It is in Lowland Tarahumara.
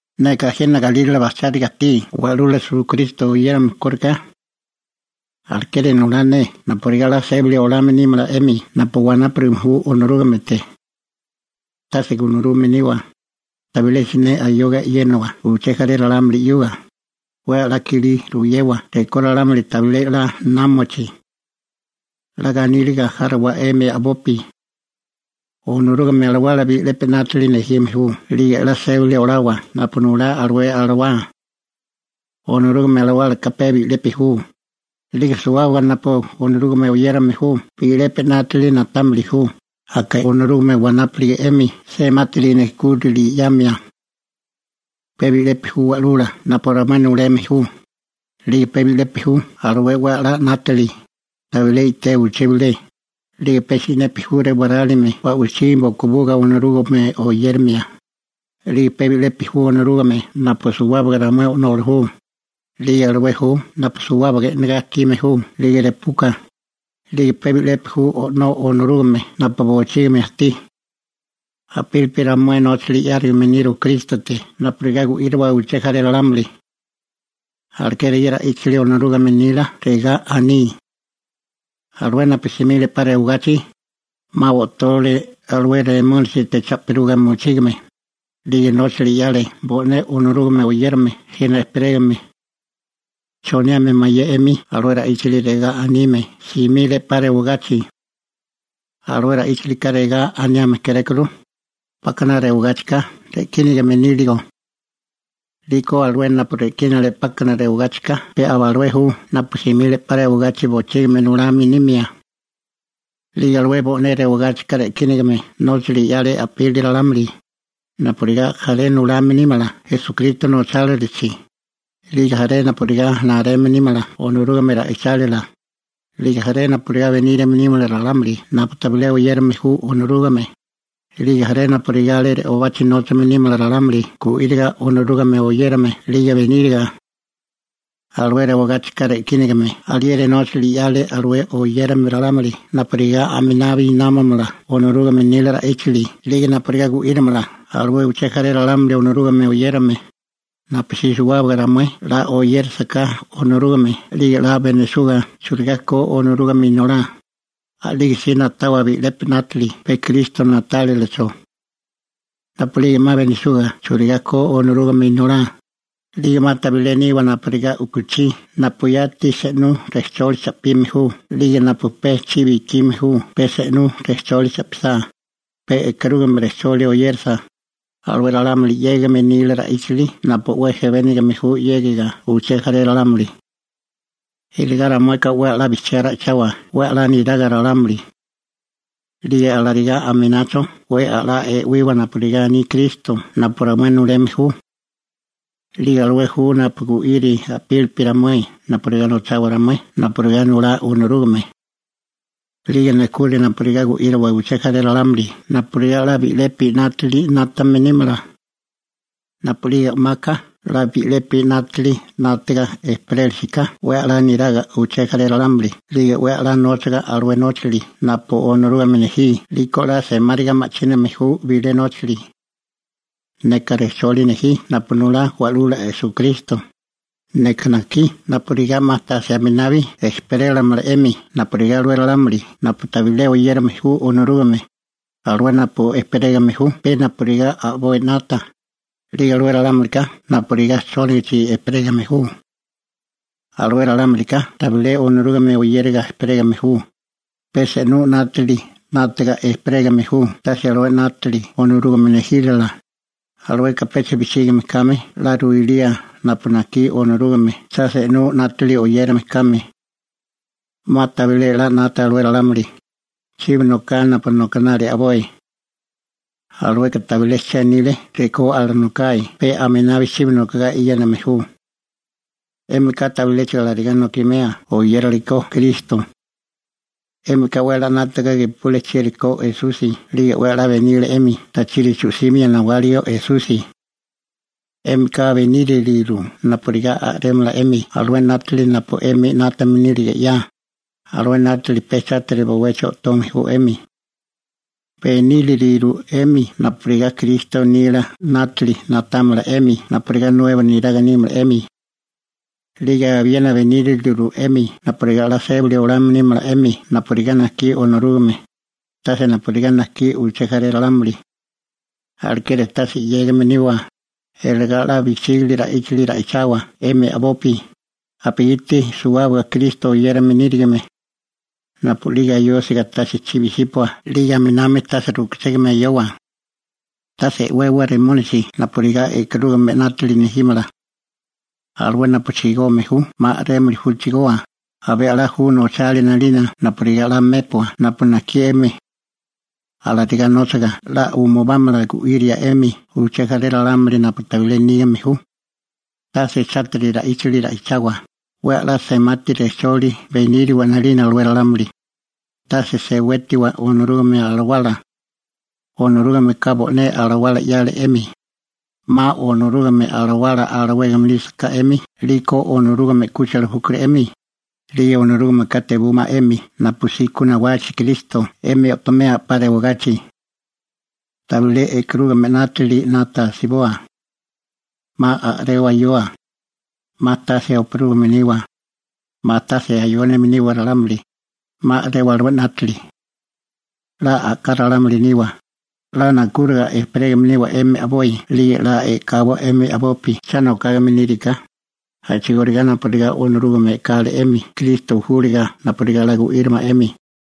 Neka jena galírale bajcháriga ajtí Wa'lula Esukristo oyérame kóriká. Alekeri nulá ne napurigá 'la sébali olame nímala 'emi napu wanápurigame ju Onorúgamete. Tase gunarume niwa, tabilé siné ayoga e'yénawa uché jaré ralámuli 'yuga, 'we 'la kilí ruyewa rekó ralámuli tabilé 'la námachi. 'La ganíliga járowa 'emi a'bopi. Onorúgame Alawala bi'lepi 'nátili nejime ju 'lige 'la sébali olawa napu nulá alué alawá. Onorúgame Alawálaka pe bi'lepi ju, 'lige suwábaga napu Onorúgame oyérame ju bi'lepi 'nátili na'támili ju, aka Onorúgame wanápulige 'emi semati nejkúrali 'yamia. Pe bi'lepi ju Wa'lula napu ramué nuleme ju, 'lige pe bi'lepi ju alué 'we a'lá 'nátili, tabilé i'té uché bilé, 'lige pe si'nepi ju rewarálime ba'wichí bokobuga Onorúgame oyérimia, 'lige pe bi'lepi ju Onorúgame napu suwábaga ramué o'nola ju, 'lige alué ju napu suwábaga e'nagá ajtime ju 'lige repuka, 'lige pe bi'lepi ju O'nó Onorúgame napu bochígimi ajtí. A'pílipi ramué nóchali 'yárigame niru Krístote napurigá gu'íriwa uché jaré ralámuli. Alekeri ye ra'íchali Onorúgame nila regá aní: Alué napu simile 'pa rewagachi, 'ma o'tole alué Remónisite cha'piruga mochígame, 'lige nóchali 'yale bo'né Onorúgame oyérame jena ejperégame. ¿Choniame mayé 'emi alué ra'íchali regá anime «simile 'pa rewagachi»? Alué ra'íchalika regá aniame kérékuru, 'pákana rewagáchika re'kínagame níligo. 'Liko alué napu re'kínale 'pákana rewagáchikana pe aba alué ju napu simile 'pa rewagachi bochígimi nulame nimia. 'Lige alué bo'né rewigáchika re'kínigame nóchali 'yale a'pili ralámuli, napurigá jaré nulame nímala Esukristo nochálilachi, 'lige jaré napurigá nareme nímala Onorúgame ra'ichálila, 'lige jaré napurigá benírame nímala ralámuli napu tabilé oyérame ju Onorúgame, 'lige jaré napurigá alé re'obachi nóchame nímala ralámuli gu'íriga Onorúgame oyérame 'lige beníriga. Alué rewagáchika re'kínagame alieri nóchali 'yale alué oyérame ralámuli napurigá aminabi námamala Onorúgame nila ra'íchali 'lige napurigá gu'írimala alué uché jaré ralámuli Onorúgame oyérame, napusí suwábaga ramué 'la oyérisiká Onorúgame 'lige 'la benisuga churigá ko Onorúgame Inolá, a'lige si na'tawa bi'lepi 'nátili pe Kristo na'tálilacho. Napu'lige 'ma benisuga churigá ko Onorúgame Inolá, a'lige 'ma tabilé niwa napurigá u'kuchí napu yati se'nú rejcholi cha'pime ju 'lige napu pe chibi ikime ju pe se'nú rejcholi cha'pisá, pe e'karúgame rejcholi oyérasa, alué ralámuli 'yégame nila ra'íchali napu 'we jebénigame ju 'yégiga uché jaré ralámuli. Iligá ramueka 'we 'la bijchiá ra'ichawa 'we 'la niraga ralámuli. 'Lige alarigá aminacho 'we 'la e'wiwa napu nulá Kristo napu ramué nuleme ju. 'Lige alué ju napu gu'iri a'pílipi ramué napurigá nochawa ramué napurigá nulá Onorúgame. 'Lige nejkuri napurigá gu'íriwa uché jaré ralámuli napurigá 'la bi'lepi 'nátili 'nátame nímala. Napu'lige o'maka 'la bi'lepi 'nátili 'nátaga ejperélisiká 'we 'la niraga uché jaré ralámuli 'lige 'we 'la nóchiga alué nóchali napu Onorúgame nejí 'liko 'la semáriga ma'chíname ju bilé nóchali. Neka rejcholi nejí napu nulá Wa'lula Esukristo, neka najkí napurigá 'ma tase aminabi ejperélamala 'emi napurigá alué ralámuli napu tabilé oyérame ju Onorúgame, alué napu ejperégame ju pe napurigá a'boi 'nata, 'lige alué ralámulika napurigá chónigichi ejperégame ju. Alué ralámulika tabilé Onorúgame oyériga ejperégame ju, pe se'nú 'nátili 'nátaga ejperégame ju tase alué 'nátili Onorúgame nejílala, alueka pecha bijchígime kame 'la ruilía napu najkí Onorúgame cha se'nú 'nátili oyérame kame. 'Ma tabilé 'la 'nata alué ralámuli, chibi noká napu nokanali a'boi. Alueka tabilé chenili rekó alanokae pe aminami chibi nokogá e'yéname ju. 'Émika tabiléchigo alarigá nokimea oyérale ko Kristo. 'Émika 'we 'la 'nátaga gepule chieri ko Esusi 'lige 'we 'la benile 'emi tachiri chu'simio nawáligo Esusi. 'Émika beníriliru napurigá a'rémala 'emi alué 'nátili napu 'emi 'nátame nílige 'ya, alué 'nátili pe chátiri bowechi o'tome ju 'emi. Beníriliru 'emi napurigá Kristo nila 'nátili na'támala 'emi napurigá nuebo neraga nímala 'emi. 'Lige abiena beníriliru 'emi napurigá 'la sébali olame nímala 'emi napurigá najkí Onorúgame, tase napurigá najkí uché jaré ralámuli. Alekeri tase 'yégame niwa, iligá 'la bijchígili ra'íchali ra'ichawa 'emi a'bopi, napugiti suwábaga Kristo oyérame nírigime. Napu'lige ayósiga tase chibi 'sípua 'lige aminami tase rukuchégame ayowa. Tase e'wawa Remónisi napurigá e'karúgamea 'nátili nejímala. Alué napu chigome ju 'ma a'rémili ju chigoa, abé a'lá ju nochalia 'nalina napurigá 'la mépua napu najkí 'emi. Alarigá nóchaga 'la umubámala gu'iria 'emi uché jaré ralámuli napu tabilé nígame ju. Tase chátiri ra'íchali ra'ichawa, 'we a'lá semátiri rejcholi beníriwa 'nalina alué ralámuli. Tase sewétiwa Onorúgame Alawala. Onorúgameka bo'né Alawala 'yale 'emi. 'Ma Onorúgame Alawala alawégame nísaká 'emi 'liko Onorúgame 'kúchila júkuru 'emi, 'lige Onorúgameka tebúmala 'emi napusí ku nawachi Kristo 'emi o'tomea 'pa rewagachi. Tabilé e'karúgame 'nátili 'nata asiboa. 'Ma a'rewa ayoa. 'Ma tase oparúgame niwa. 'Ma tase ayónime niwa ralámuli, 'ma a'rewa alué 'nátili. 'La a'ká ralámuli niwa, 'la nakúriga ejperégame niwa 'emi a'boi 'lige 'la e'kawa 'emi a'bopi cha nokágame níriká, a'chigóriga napurigá Onorúgame e'kale 'emi Kristo júlaga napurigá 'la gu'írimala 'emi.